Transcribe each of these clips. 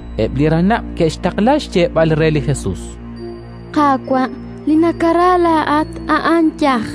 Eb' li ranab' ke'xtaqla xyeeb'al re li Jesus: —Qaawa', li nakara laa'at a'an yaj.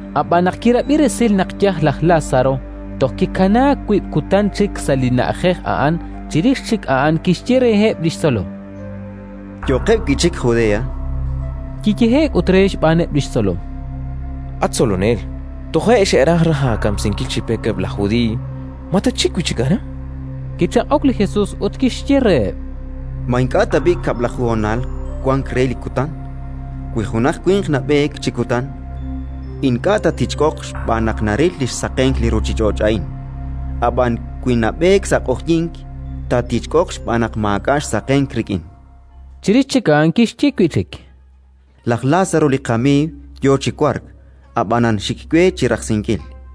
ab'an, naq kirab'i resil naq yaj laj Lázaro, toj kikanaak wiib' kutan chik sa' li na'ajej a'an. Chirix chik a'an kixye reheb' li xtzolom: —Yo'qeb' wi' chik Judea. Kiyehe'k ut re xb'aaneb' li xtzolom: —At Tzolonel, toje' xe'raj raj aakamsinkil chi pek eb' laj Judiiy. Ma tatxik wi' chik aran? Kichaq'ok li Jesus ut kixye reheb': —Ma ink'a' tab'i' kab'laju honal wank re li kutan? Wi junaq winq nab'eek chi kutan, ink'a' taatichk'oq xb'aan naq naril li xsaqenk li ruuchich'och' a'in; ab'an wi nab'eek sa' q'oqyink, taatichk'oq xb'aan naq maak'a' xsaqenk rik'in. Chirix chik a'an kixye wi' chik: —Laj Lázaro li qamiiw yo chi wark; ab'anan xik we chi rajsinkil.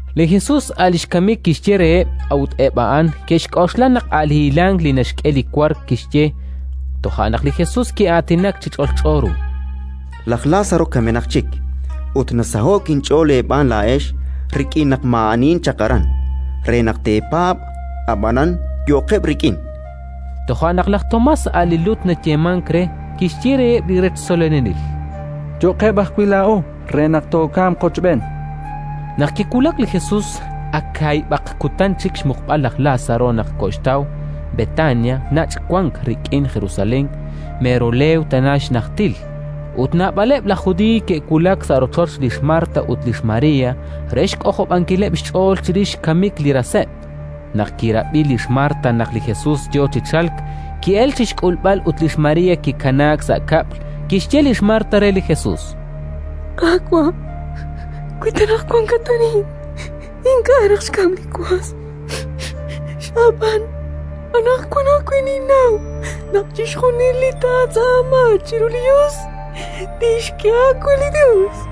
Li Jesus a' li xkamik kixye reheb', a'ut eb' a'an ke'xk'oxla naq a' li hilank li naxk'e li wark kixye. Toja' naq li Jesus ki'aatinak chi ch'olch'o ru: —Laj Lázaro kamenaq chik, ut nasaho'k inch'ool eeb'aan laa'ex rik'in naq maa'anihin chaq aran, re naq teepaab'. Ab'anan, yo'qeb' rik'in, chan. Toja' naq laj Tomás, a' li Lut nayeemank re, kixye reheb' li rech tzolonelil: —Yo'qeb' ajwi' laa'o re naq tookamq qochb'een. Naq kiwulak li Jesus, ak kaahib'aq kutan chik xmuqb'al laj Lázaro naq koxtaw. Betania nach' wank rik'in Jerusalén, mero leew tana xnajtil, ut naab'aleb' laj Judiiy ke'wulak sa' rochoch lix Marta ut lix María re xk'ojob'ankileb' xch'ool chirix xkamik li raseb'. Naq kirab'i lix Marta naq li Jesus yo chi chalk, ki'elk chi xk'ulb'al, ut lix María kikanaak sa' kab'l. Kixye lix Marta re li Jesus: —Qaawa', wi ta wankat arin, ink'a' raj xkamk li was. Ab'an, anaqwan ajwi', ninnaw naq chixjunil li taatz'aama chiru li Yos, tixk'e aawe li Yos.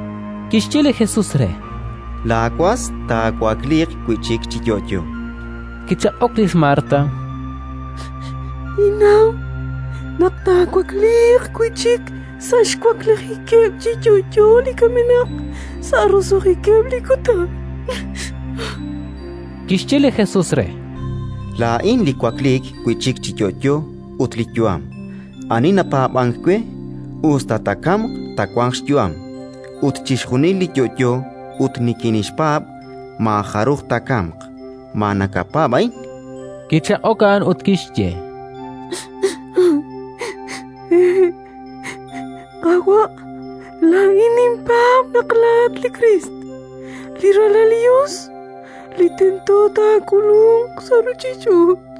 Kixye li Jesus re: —Laawas taawakliiq wi' chik chi yo'yo. Kichaq'ok lix Marta: —Ninnaw naq taawakliiq wi' chik sa' xwaklijikeb' chi yo'yo li kamenaq, sa' roso'jikeb' li kutan, chan. Kixye li Jesus re: —Laa'in li wakliik wi' chik chi yo'yo ut li yu'am. Ani napaab'ank we, us ta taakamq, taawanq xyu'am, ut chixjunil li yo'yo ut nikinxpaab' maajaruj taakamq. Ma nakapaab' a'in? Kichaq'ok a'an ut kixye: —Hehe', Qaawa'. Laa'in ninpaab' naq laa'at li Kriist, li Ralal li Yos, li tento taak'ulunq sa' ruuchich'och'.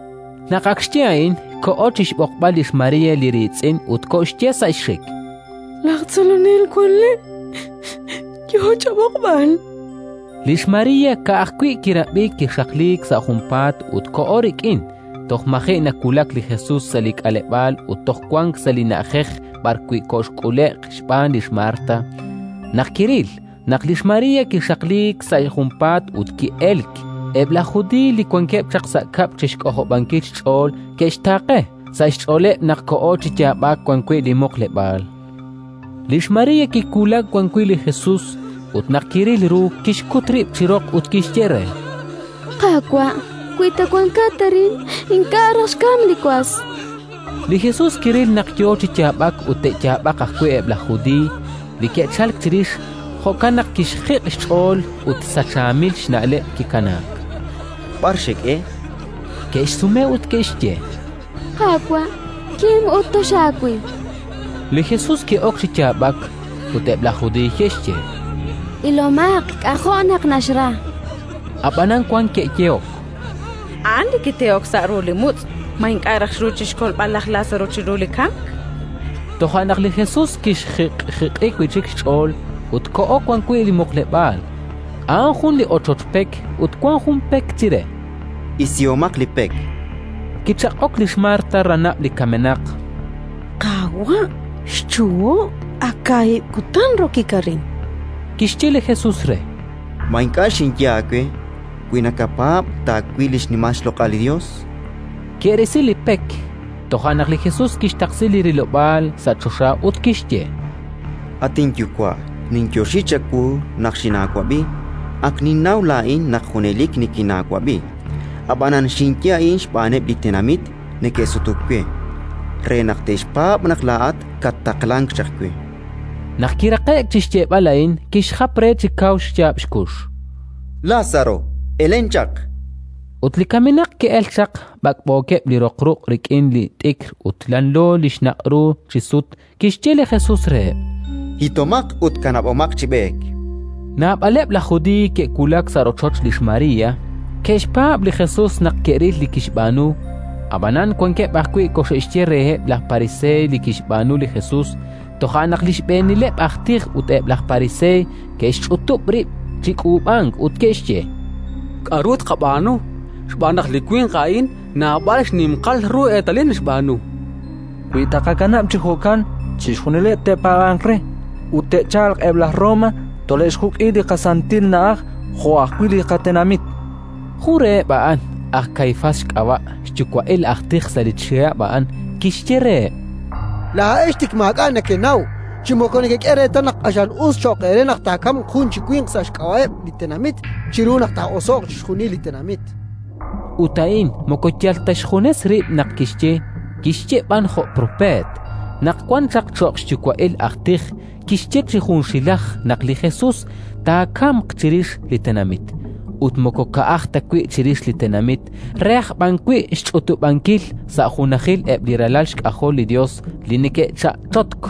Naq ak xye a'in, koho chi xb'oqb'al lix María, li riitz'in, ut koxye sa' xxik: —Laj Tzolonel wank le'; yo chab'oqb'al. Lix María, ka'ajwi' kirab'i, kixaqliik sa' junpaat ut koho rik'in. Toj maji' nawulak li Jesus sa' li k'aleb'aal ut toj wank sa' li na'ajej b'arwi' koxk'ule'q xb'aan lix Marta. Naq ke'ril naq lix María kixaqliik sa' junpaat ut ki'elk, eb' laj Judiiy li wankeb' chaq sa' kab'l chi xk'ojob'ankil xch'ool ke'xtaaqe: sa' xch'ooleb' naq koho chi yaab'ak wan wi' li muqleb'aal. Lix María kiwulak wan wi' li Jesus, ut naq kiril ru, kixkut rib' chi roq ut kixye re: —Qaawa', wi ta wankat arin, ink'a' raj xkamk li was. Li Jesus kiril naq yo chi yaab'ak ut te'yaab'aq ajwi' eb' laj Judiiy li ke'chalk chirix; jo'kan naq kixjiq' xch'ool ut sachaamil xna'leb' kikanaak: —B'ar xek'e? chan. Ke'xsume ut ke'xye: —Qaawa', kim ut toxaawil. Li Jesus ki'ok chi yaab'ak. Ut eb' laj Judiiy ke'xye: —Ilomaq k'ajo' naq naxra. Ab'anan wank ke'yehok: —A'an li kitehok xsa' ru li mutz', ma ink'a' raj xru chi xkolb'al laj Lázaro chiru li kamk? Toja' naq li Jesus kixjiq'jiq'i wi' chik xch'ool ut koho wan wi' li muqleb'aal. A'an jun li ochoch pek ut wank jun pek chire. —Isihomaq li pek, chan li Jesus. Kichaq'ok lix Marta, ranab' li kamenaq: —Qaawa', xchuho': ak kaahib' kutan rokik arin, chan re. Kixye li Jesus re: —Ma ink'a' xinye aawe: «Wi nakapaab', taawil li xnimal xloq'al li Yos»? Ke'risi li pek. Toja' naq li Jesus kixtaqsi li rilob'aal sa' choxa ut kixye: —At inYuwa', ninyoxi chawu naq xinaawab'i. Ak ninnaw laa'in naq junelik nikinaawab'i, ab'anan xinye a'in xb'aaneb' li tenamit neke'sutuk we, re naq te'xpaab' naq laa'at kattaqlank chaq we. Naq kiraqe'k chi xyeeb'al a'in, kixjap re chi kaw xyaab' xkux: —Lázaro, elen chaq, chan. Ut li kamenaq ki'elk chaq, b'ak'b'ookeb' li roq ruq' rik'in li t'ikr ut lanlo li xnaq' ru chi sut. Kixye li Jesus reheb': —Hitomaq ut kanab'omaq chi b'eek. Naab'aleb' laj Judiiy li ke'wulak sa' rochoch lix María, ke'xpaab' li Jesus naq ke'ril li kixb'aanu. Ab'anan wankeb' ajwi' koxe'xye reheb' laj Pariseey li kixb'aanu li Jesus. Toja' naq li Xb'eenileb' aj tij ut eb' laj Pariseey ke'xch'utub' rib' chi k'uub'ank ut ke'xye: —K'aru tqab'aanu? Xb'aan naq li winq a'in naab'al xninqal ru eetalil naxb'aanu. Wi taaqakanab' chi jo'kan, chixjunileb' te'paab'anq re, ut te'chalq eb' laj Roma, tole'xjuk' li qaSantil Na'aj jo' ajwi' li qatenamit. Jun reheb' a'an, aj Kaifás xk'ab'a', xyuwa'il aj tij sa' li chihab' a'an, kixye reheb': —Laa'ex tik maak'a' nekenaw, chi moko nekek'e reetal naq q'axal us cho'q eere naq taakamq jun chi winq sa' xk'ab'a'eb' li tenamit chiru naq taa'oso'q chixjunil li tenamit. Ut a'in moko yal ta xjunes rib' naq kixye, kixye b'an jo' propeet, naq wan chaq cho'q xyuwa'il aj tij; kixye chi junxilaj naq li Jesus taakamq chirix li tenamit, ut moko ka'aj ta wi' chirix li tenamit, re aj b'an wi' xch'utub'ankil sa' junajil eb' li ralal xk'ajol li Yos li neke'cha'chotk.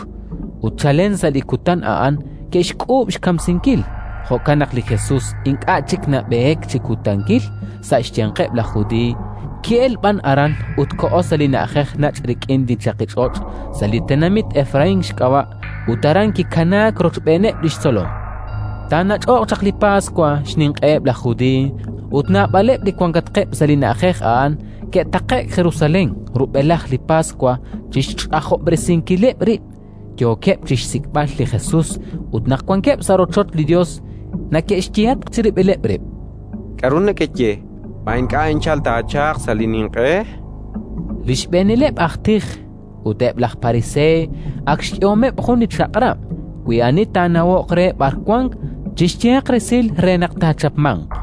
Ut chalen sa' li kutan a'an ke'xk'uub' xkamsinkil. Jo'kan naq li Jesus ink'a' chik nab'eek chi kutankil sa' xyanqeb' laj Judiiy, ki'elk b'an aran ut koho sa' li na'ajej nach' rik'in li chaqich'och', sa' li tenamit Efraín xk'ab'a', ut aran kikanaak rochb'eeneb' li xtzolom. Taanach'oq chaq li Paswa, xninq'eheb' laj Judiiy, ut naab'aleb' li wankatqeb' sa' li na'ajej a'an ke'taqe'k Jerusalén rub'elaj li Paswa chi xch'ajob'resinkileb' rib'. Yookeb' chi xsik'b'al li Jesus ut naq wankeb' sa' rochoch li Yos, neke'xyehatq chirib'ileb' rib': —K'aru nekeye? Ma ink'a' anchal taachalq sa' li ninq'e? Li Xb'eenileb' aj tij ut eb' laj Pariseey ak xk'ehomeb' jun li chaq'rab': “Wi ani taanawoq re b'ar wanq, chixyehaq resil re naq taachapmanq”.